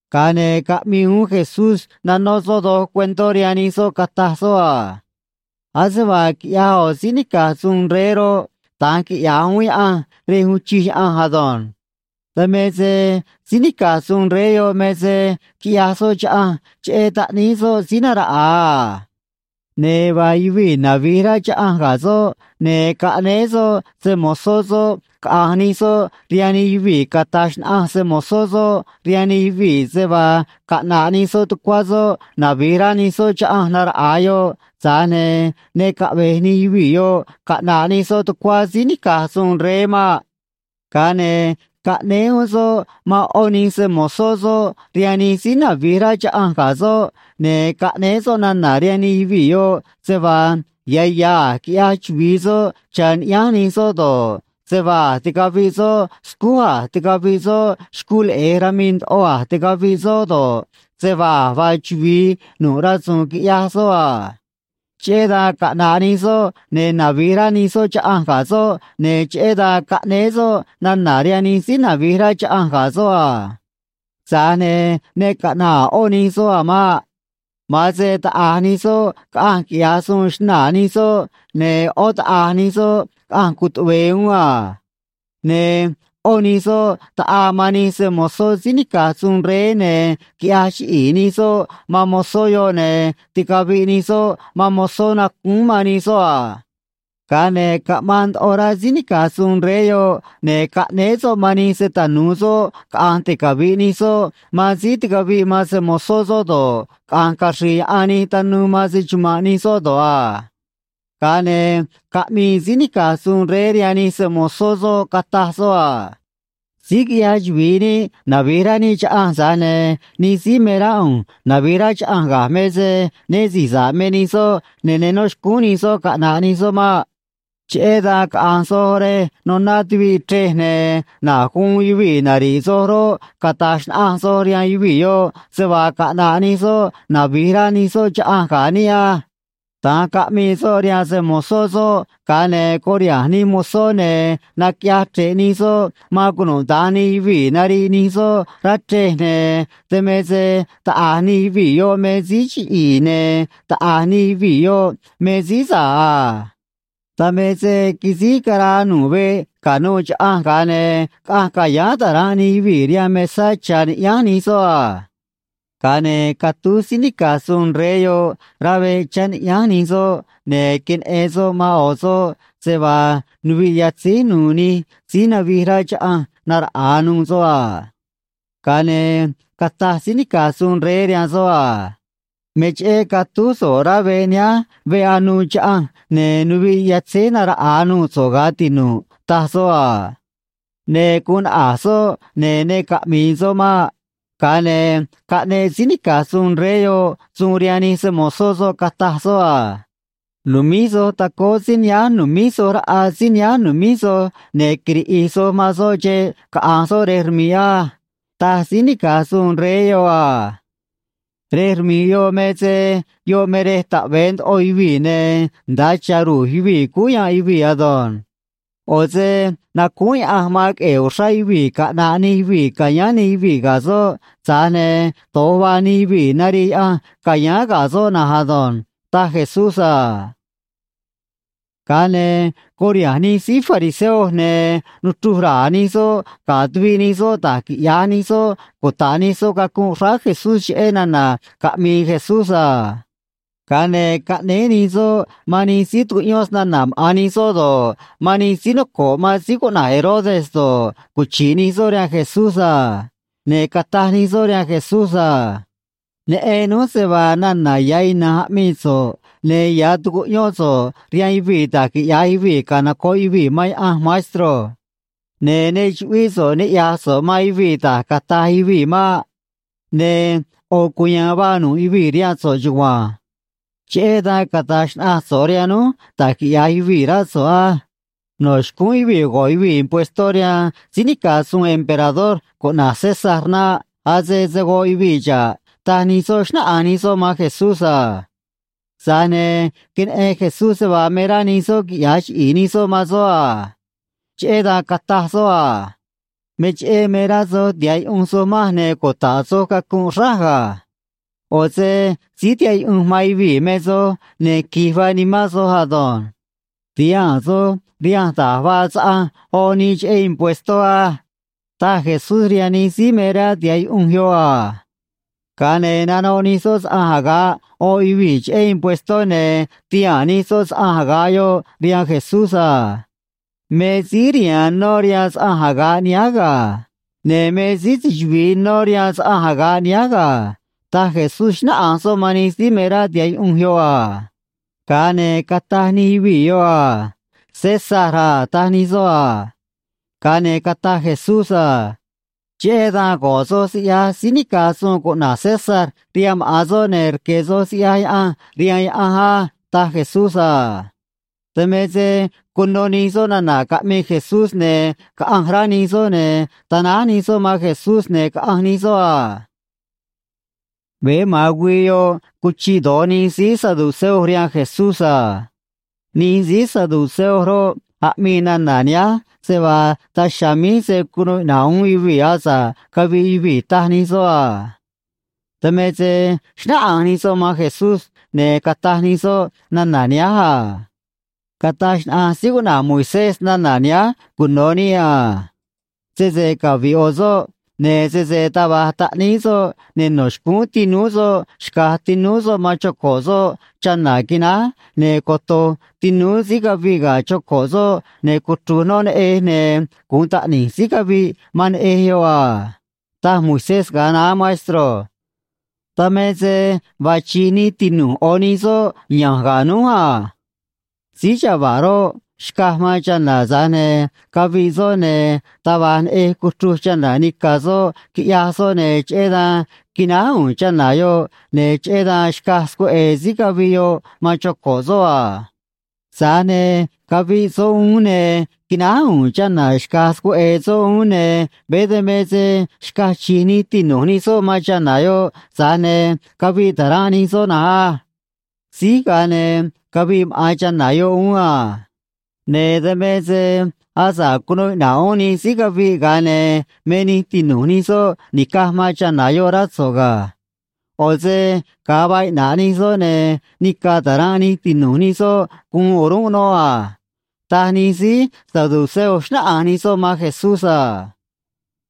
Ga̱a ne̱ caꞌmii uún Jesús, nanó soꞌ doj cuentó rihaan nij soꞌ, cataj soꞌ a: ―Ase vaa quiꞌyaj ꞌo̱ síí nica̱j suun rey roꞌ, da̱nj quiꞌya̱j uún Yaꞌanj rej uun chij Yaꞌanj ado̱nj. Dan me se síí nica̱j suun rey yoꞌ me se quiꞌyaj soꞌ chaꞌanj cheꞌé taꞌníí soꞌ síí naraꞌa̱a a. Ne̱ vaa yuvii̱ navi̱j rá chaꞌanj ga̱ soꞌ, ne̱ caꞌnéé soꞌ se‑mo̱zó soꞌ caꞌa̱nj nij soꞌ rihaan nij yuvii̱, cata̱j xnaꞌanj se‑mo̱zó soꞌ rihaan nij yuvii̱ se vaa caꞌna̱ꞌ nij soꞌ tucuá soꞌ navi̱j rá nij soꞌ chaꞌanj naraꞌa̱a yoꞌ, tza̱j ne̱ ne caꞌve̱j nij yuvii̱ yoꞌ caꞌna̱ꞌ nij soꞌ tucuá síí nica̱j suun rey maꞌ. Ga̱a ne̱ caꞌnéé uún soꞌ man ꞌó nij se‑mo̱zó soꞌ rihaan nij síí navi̱j rá chaꞌanj ga̱ soꞌ, ne̱ caꞌnéé soꞌ nana̱ rihaan nij yuvii̱ yoꞌ se vaa ya̱ ya̱ a̱j quiꞌyaj chuvi̱i soꞌ cha̱ niꞌyánj nij soꞌ do̱ꞌ, se vaa a̱j ticaviꞌ soꞌ scúj a̱j ticaviꞌ soꞌ xcuu leꞌe̱j rami̱i̱ ndoꞌo a̱j ticaviꞌ soꞌ do̱ꞌ, se vaa a̱j vaa chuvi̱i nu̱ꞌ rasu̱u̱n quiꞌyaj soꞌ a. Cheꞌé dan caꞌna̱ꞌ nij soꞌ, ne̱ navi̱j rá nij soꞌ chaꞌanj ga̱ soꞌ, ne̱ cheꞌé dan caꞌnéé soꞌ nana̱ rihaan nij síí navi̱j rá chaꞌanj ga̱ soꞌ a. ’Tza̱j ne̱ ne caꞌna̱ꞌ a̱ ꞌó nij soꞌ a̱ maꞌ. Ma̱an se taꞌa̱j nij soꞌ caꞌanj quiꞌya̱j suun xnaa̱ nij soꞌ, ne̱ ꞌó taꞌa̱j nij soꞌ caꞌanj cutuꞌve̱e̱ uún a. Ne̱ ꞌó nij soꞌ taꞌaa man nij se‑mo̱zó síí nica̱j suun rey, ne̱ quiꞌyaj chiꞌi̱i̱ nij soꞌ man mozó yoꞌ, ne̱ ticaviꞌ nij soꞌ man mozó nacúún man nij soꞌ a. Ga̱a ne̱ caꞌmaan ndoꞌo rá síí nica̱j suun rey yoꞌ, ne̱ caꞌnéé soꞌ man nij se‑tanu̱u soꞌ caꞌa̱nj ticavi̱ꞌ nij soꞌ man síí ticaviꞌ man se‑mo̱zó soꞌ do̱ꞌ, caꞌa̱nj caxri̱i̱ yaꞌan nij tanuu man se‑chuma̱nꞌ nij soꞌ do̱ꞌ a. ’Ga̱a ne̱ caꞌmii síí nica̱j suun rey rihaan nij se‑mo̱zó soꞌ, cataj soꞌ a: “Síj quiꞌyaj chuvi̱i níꞌ navi̱j rá níꞌ chaꞌanj, tza̱j ne̱ nij síí me rá ꞌu̱nj navi̱j rá chaꞌanj ga̱j me se né si̱j sa̱ꞌ me nij soꞌ ne̱ ne nó xcúún nij soꞌ caꞌna̱ꞌ nij soꞌ maꞌ. Cheꞌé dan caꞌa̱nj soj rej noná tuviꞌ chrej, ne̱ na̱j guun yuvii̱ nari̱ꞌ soj roꞌ, cata̱j xnaꞌanj soj rihaan yuvii̱ yoꞌ se vaa caꞌna̱ꞌ nij soꞌ navi̱j rá nij soꞌ chaꞌanj ga̱ níꞌ á.” Da̱nj caꞌmii soꞌ rihaan se‑mo̱zó soꞌ, ga̱a ne̱ curiha̱nj nij mozó, ne̱ naquiꞌyaj chre̱ꞌ nij soꞌ man cunuda̱nj nij yuvii̱ nariꞌ nij soꞌ rá chrej, ne̱ dan me se taꞌa̱j nij yuvii̱ yoꞌ me síí chiꞌi̱i̱, ne̱ taꞌa̱j nij yuvii̱ yoꞌ me síí sa̱ꞌ a. Dan me se quisíj caraa nu̱ꞌ veꞌ ca̱nuû chaꞌanj, ga̱a ne̱ caꞌanj ca̱yáán ta̱ranꞌ nij yuvii̱ rihaan mesá cha̱ niꞌyánj nij soꞌ a. ’Ga̱a ne̱ catúj síí nica̱j suun rey yoꞌ rá veꞌ chá niꞌyánj nij soꞌ, ne̱ queneꞌen soꞌ man ꞌo̱ soꞌ, se vaa nuviꞌ yatzíj nu̱u̱ nij síí navij rá chaꞌanj naraꞌa̱a nuû soꞌ a. Ga̱a ne̱ cataj síí nica̱j suun rey rihaan soꞌ a: “Me cheꞌé catúj so̱ꞌ rá veꞌ nihánj veꞌ anuû chaꞌanj, ne̱ nuviꞌ yatzíj naraꞌa̱a nuû so̱ꞌ, ga̱ tinu̱ꞌ”, taj soꞌ a. Ne̱ guun naꞌa̱j soꞌ, ne̱ ne caꞌmi̱i̱ soꞌ maꞌ. Ga̱a ne̱ caꞌneꞌ síí nica̱j suun rey yoꞌ suun rihaan nij se‑mo̱zó soꞌ, cataj soꞌ a: “Nu̱míj soj tacóó síí nihánj nu̱míj soj raꞌa síí nihánj nu̱míj soj, ne̱ quiriꞌi̱j soj man soꞌ xeꞌ caꞌa̱nj soꞌ rej rmi̱ꞌ á”, taj síí nica̱j suun rey yoꞌ a. Rej rmi̱ꞌ yoꞌ me se yoꞌ me rej taꞌve̱e ndoꞌo yuvii̱ ne̱ nda̱a cha̱ ru̱j yuvii̱ cúú yanꞌ yuvii̱ ado̱nj. ꞌO̱ se nacúún Yaꞌanj man queꞌe̱e̱ uxrá yuvii̱ caꞌna̱ꞌ nij yuvii̱ ca̱yáán nij yuvii̱ ga̱ soꞌ, tza̱j ne̱ do̱j vaa nij yuvii̱ narii Yaꞌanj ca̱yáán ga̱ soꞌ na̱nj ado̱nj ―taj Jesús a. Ga̱a ne̱ curiha̱nj nij síí fariseo, ne̱ nuchruj ra̱a̱ nij soꞌ ga̱ tuviꞌ nij soꞌ da̱j quiꞌya̱j nij soꞌ cuta̱ꞌ nij soꞌ cacunꞌ xráá Jesús cheꞌé nana̱ caꞌmi̱i̱ Jesús a. Ga̱a ne̱ caꞌnéé nij soꞌ man nij síí tucuꞌyón snana̱ maꞌa̱n nij soꞌ do̱ꞌ, man nij síí noco̱ꞌ man síí cuꞌna̱j Herodes do̱ꞌ, cuchi̱ꞌ nij soꞌ rihaan Jesús a. Ne̱ cataj nij soꞌ rihaan Jesús a: ―Neꞌen núj se vaa nana̱ ya̱ ina̱nj aꞌmii so̱ꞌ, ne̱ ya̱ tucuꞌyón so̱ꞌ rihaan yuvii̱ da̱j quiꞌya̱j yuvii̱ canoco̱ꞌ yuvii̱ man Yaꞌanj, maestro. Ne̱ ne chuꞌvíꞌ so̱ꞌ niꞌya̱j so̱ꞌ man yuvii̱ da̱j cata̱j yuvii̱ maꞌ. Ne̱ ꞌo̱ cuya̱a̱n vaa nu̱ꞌ yuvii̱ rihaan so̱ꞌ chugua̱nj. Cheꞌé dan cata̱j xnaꞌanj so̱ꞌ rihaan núj da̱j quiꞌya̱j yuvii̱, rá so̱ꞌ á: No̱ xcúún yuvii̱ go̱ꞌ yuvii̱ impuestó rihaan síí nica̱j suun emperador cuꞌna̱j César naꞌ. Ase se̱ goꞌ yuvii̱ xa̱ꞌ ―taj nij soꞌ, xnáꞌanj nij soꞌ man Jesús a. Tza̱j ne̱ queneꞌen Jesús se vaa me rá nij soꞌ quiꞌya̱j chiꞌi̱i̱ nij soꞌ man soꞌ a. Cheꞌé dan cataj soꞌ a: ―Me cheꞌé me rá soj tiha̱ꞌ yuꞌunj soj manj ne̱ cuta̱ꞌ soj cacunꞌ xráj ga̱. ꞌO̱ se síí tihaꞌ yuꞌunj man yuvii̱ me soj, ne̱ qui̱j vaa nimán soj ado̱nj. Ti̱haa̱n soj rihanj da̱j vaa saꞌanj oꞌ nii cheꞌé impuestó á ―taj Jesús rihaan nij síí me rá tiha̱ꞌ yuꞌunj yoꞌ a. Ga̱a ne̱ nanoꞌ nij soꞌ saꞌanj aga̱ꞌ oꞌ yuvii̱ cheꞌé impuestó, ne̱ tihaa̱n nij soꞌ saꞌanj aga̱ꞌ yoꞌ rihaan Jesús a. ―Me síí riha̱a̱n nó rihaan saꞌanj aga̱ꞌ nihánj ga̱. Ne̱ me síí se‑chuvi̱i nó rihaan saꞌanj aga̱ꞌ nihánj ga̱ ―taj Jesús, xnáꞌanj soꞌ man nij síí me rá tiha̱ꞌ yuꞌunj yoꞌ a. Ga̱a ne̱ cataj nij yuvii̱ yoꞌ a: ―César a ―taj nij soꞌ a. Ga̱a ne̱ cataj Jesús a: ―Cheꞌé dan go̱ꞌ soj siꞌyaj síí nica̱j suun cuꞌna̱j César rihaan maꞌa̱n soꞌ, ne̱ rque̱ soj siꞌyaj Yaꞌanj rihaan Yaꞌanj á ―taj Jesús a. Dan me se cuno nij soꞌ nana̱ caꞌmii Jesús, ne̱ caꞌanj rá nij soꞌ, ne̱ tanáj nij soꞌ man Jesús, ne̱ caꞌanj nij soꞌ a. Veé ma̱an güii yoꞌ cuchiꞌ do̱j nij síí saduceo rihaan Jesús a. Nij síí saduceo roꞌ, aꞌmii nana̱ nihánj se vaa daj chiha̱a̱ míj se̱ cunuu iꞌna̱ꞌ uún yuvii̱ asa̱ꞌ caviꞌ yuvii̱, taj nij soꞌ a. Dan me se xnáꞌanj nij soꞌ man Jesús, ne̱ cataj nij soꞌ nana̱ nihánj a: ―Cataj xnaꞌanj síí cuꞌna̱j Moisés nana̱ nihánj cuno̱ níꞌ a: “Sese caviꞌ ꞌo̱ soꞌ, ne̱ sese taj va̱j taꞌníí soꞌ, ne̱ no̱ xcúún tinúú soꞌ xca̱j tinúú soꞌ man choco̱ꞌ soꞌ chana̱ quináj, ne̱ coto̱j tinúú síí caviꞌ ga̱ choco̱ꞌ soꞌ, ne̱ cuchru̱j noꞌ neꞌej, ne̱ gu̱un taꞌni̱j síí caviꞌ man neꞌej yoꞌ a”, taj Moisés ga̱a naá, maestro. Dan me se vaa chi̱j nij tinu̱j ꞌo̱ nij soꞌ ya̱nj ga̱ núj a. Síí chava̱ꞌ roꞌ, xcaj man chana̱, tza̱j ne̱ caviꞌ soꞌ, ne̱ taj va̱j neꞌej cuchruj chana̱ nica̱ soꞌ, quiꞌyaj soꞌ, ne̱ cheꞌé dan quináj u̱u̱n chana̱ yoꞌ, ne̱ cheꞌé dan xcaj scueꞌe̱e̱ síí caviꞌ yoꞌ man choco̱ꞌ soꞌ a. Tza̱j ne̱ caviꞌ soꞌ uún, ne̱ quináj u̱u̱n chana̱ xca̱j scueꞌe̱e̱ soꞌ uún, ne̱ veé dan me se xcaj chi̱j nij tinu̱j nij soꞌ man chana̱ yoꞌ, tza̱j ne̱ caviꞌ ta̱ranꞌ nij soꞌ na̱nj á. Síj, ga̱a ne̱ caviꞌ maꞌa̱n chana̱ yoꞌ uún a. Ne̱ dan me se asa̱ꞌ cunuu iꞌna̱ꞌ uún nij síí caviꞌ, ga̱a ne̱ me nij tinu̱j nij soꞌ ni̱caj man chana̱ yoꞌ, rá so̱ꞌ ga̱. ꞌO̱ se ga̱a vaa iꞌna̱ꞌ nij soꞌ, ne̱ nica̱ ta̱ranꞌ nij tinu̱j nij soꞌ guun o̱rúnꞌ noꞌ a ―taj nij síí saduceo, xnáꞌanj nij soꞌ man Jesús a.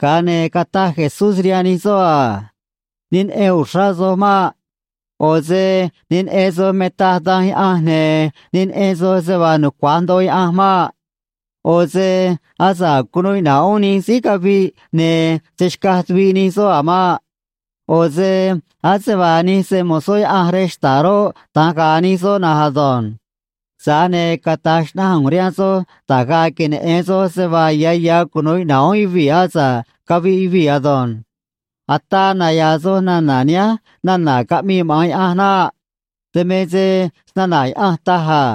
Ga̱a ne̱ cataj Jesús rihaan nij soꞌ a: ―Ne neꞌen uxrá soj maꞌ. ꞌO̱ se ne neꞌen soj me taj Danj Yaꞌanj, ne̱ ne neꞌen soj se vaa nucua̱j ndoꞌo Yaꞌanj maꞌ. ꞌO̱ se asa̱ꞌ cunuu iꞌna̱ꞌ uún nij síí caviꞌ, ne̱ se̱ xcaj tuviꞌ nij soꞌ a̱ maꞌ. ꞌO̱ se ase vaa nij se‑mo̱zó Yaꞌanj rej xta̱ꞌ roꞌ, da̱nj ga̱a̱ nij soꞌ na̱nj ado̱nj. Tza̱j ne̱ cata̱j xnaꞌanj ꞌu̱nj rihaan soj da̱j ga̱a̱ queneꞌe̱n soj se vaa ya̱ ya̱ cunu̱u iꞌna̱ꞌ uún yuvii̱ asa̱ꞌ caviꞌ yuvii̱ ado̱nj. Ataa naya̱a̱ soj nana̱ nihánj nana̱ caꞌmii maꞌa̱n Yaꞌanj naꞌ. Dan me se snana̱ Yaꞌanj taj a: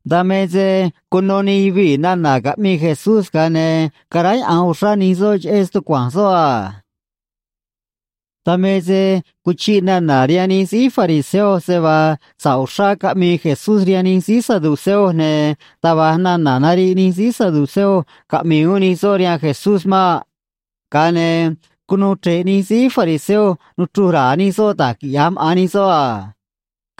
Dan me se cuno nij yuvii̱ nana̱ caꞌmii Jesús, ga̱a ne̱ caráyaꞌa̱nj uxrá nij soꞌ cheꞌé stucua̱nj soꞌ a. Dan me se cuchiꞌ nana̱ rihaan nij síí fariseo se vaa sa̱ꞌ uxrá caꞌmii Jesús rihaan nij síí saduceo ne̱ taj va̱j nana̱ nariꞌ nij síí saduceo caꞌmi̱i̱ uún nij soꞌ rihaan Jesús maꞌ. Ga̱a ne̱ cunuu chre̱ꞌ nij síí fariseo nuchruj ra̱a̱ nij soꞌ da̱j quiꞌya̱j maꞌa̱n nij soꞌ a.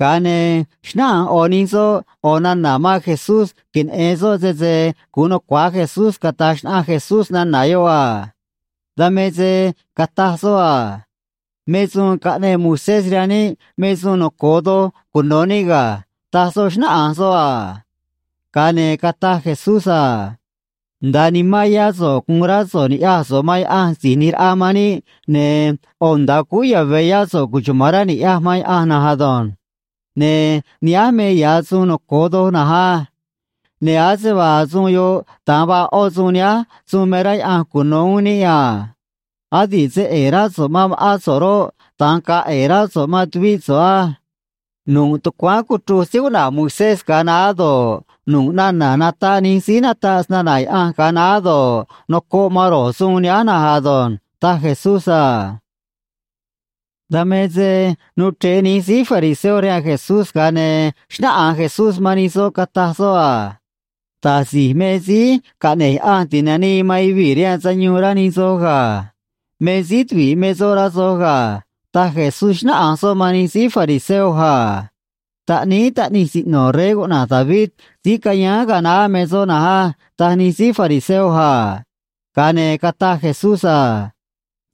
Ga̱a ne̱ xnáꞌanj ꞌo̱ nij soꞌ ꞌo̱ nana̱ man Jesús, queneꞌe̱n soꞌ sese gu̱un nucua̱j Jesús cata̱j xnaꞌanj Jesús nana̱ yoꞌ a. Dan me se cataj soꞌ a: ―Me suun caꞌneꞌ Moisés rihaan níꞌ me suun noco̱o doj cuno̱ níꞌ ga̱ ―taj soꞌ, xnáꞌanj soꞌ a. Ga̱a ne̱ cataj Jesús a: ―“Nda̱a nimán yá so̱ꞌ gu̱un rá so̱ꞌ ni̱ꞌyaj so̱ꞌ man Yaꞌanj Si̱j ꞌNi̱j Raꞌa man níꞌ, ne̱ ꞌo̱ nda̱a cúú yave̱ yá so̱ꞌ cuchuma̱n rá ni̱ꞌyaj man Yaꞌanj na̱nj ado̱nj.” Ne̱ nihánj me ya̱ suun noco̱o doj na̱nj á. Ne̱ ase vaa suun yoꞌ, da̱nj vaa ꞌó suun nihánj suun me rá Yaꞌanj cuno̱ uún níꞌ a: “Adi̱ꞌ se ꞌe̱e̱ rá so̱ꞌ man ma̱ꞌán so̱ꞌ roꞌ, da̱nj ga̱a̱ ꞌe̱e̱ rá so̱ꞌ man tuvíꞌ so̱ꞌ á.” Nu̱ꞌ tucuáán cuchruj síí cuꞌna̱j Moisés ga̱a naá do̱ꞌ, nu̱ꞌ nana̱ nataꞌ nij síí nataꞌ snana̱ Yaꞌanj ga̱a naá do̱ꞌ, nocoꞌ man ro̱j suun nihánj na̱nj ado̱nj ―taj Jesús a. Dan me se nuu chre̱ꞌ nij síí fariseo rihaan Jesús, ga̱a ne̱ xnáꞌanj Jesús man nij soꞌ, cataj soꞌ a: ―Da̱j si̱j me Síí Caꞌne̱j Yaꞌanj Ti̱nanii man Yuvii̱ rihaan Sayuun, rá nij soj ga̱. Me síí tuvi̱ꞌ me soꞌ, rá soj ga̱ ―taj Jesús, xnáꞌanj soꞌ man nij síí fariseo a. ―Taꞌníí taꞌnij siꞌno̱ rey cuꞌna̱j David síí cayáán ga̱a naá me soꞌ na̱nj á ―taj nij síí fariseo a. Ga̱a ne̱ cataj Jesús a: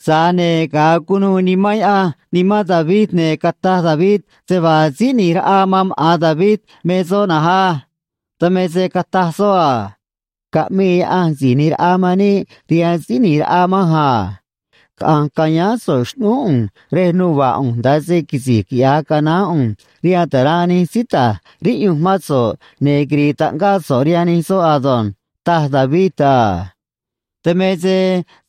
―Tza̱j ne̱ ga̱a cunuû Nimán Yaꞌanj nimán David, ne̱ cataj David se vaa Síí ꞌNi̱j Raꞌa man maꞌa̱n David me soꞌ na̱nj á. Dan me se cataj soꞌ a: Caꞌmii Yaꞌanj Si̱j ꞌNi̱j Raꞌa man níꞌ rihaan Síí ꞌNi̱j Raꞌa manj a: “Caꞌa̱nj ca̱yáán so̱ꞌ xꞌnúú ꞌu̱nj rej nuva̱ꞌ ꞌu̱nj, nda̱a se quisi̱j quiꞌya̱j canaán ꞌu̱nj rihaan ta̱ranꞌ nij síí ta̱j riꞌyunj mán so̱ꞌ, ne̱ quiri̱i̱ taꞌngáꞌ so̱ꞌ rihaan nij soꞌ ado̱nj”, taj David a. Dan me se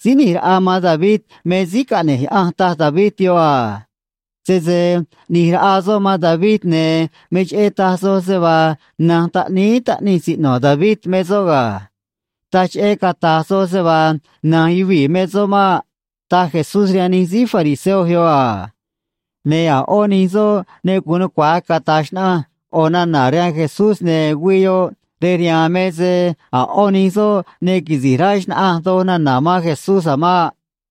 Síí ꞌNi̱j Raꞌa man David me Síí Caꞌne̱j Yaꞌanj, taj David yoꞌ a. Sese ꞌni̱j raꞌa soꞌ man David, ne̱ me cheꞌé taj soj se vaa na̱nj taꞌníí taꞌnij siꞌno̱ David me soꞌ ga̱. Taj cheꞌé cata̱j soj se vaa na̱nj yuvii̱ me soꞌ maꞌ ―taj Jesús rihaan nij síí fariseo yoꞌ a. Ne̱ a̱ ꞌó nij soꞌ ne gu̱un nucua̱j cata̱j xnaꞌanj ꞌo̱ nana̱ rihaan Jesús, ne̱ güii yoꞌ rej rihaan me se a̱ ꞌó nij soꞌ ne quisi̱j rá xna̱ꞌanj doj nana̱ man Jesús a̱ maꞌ.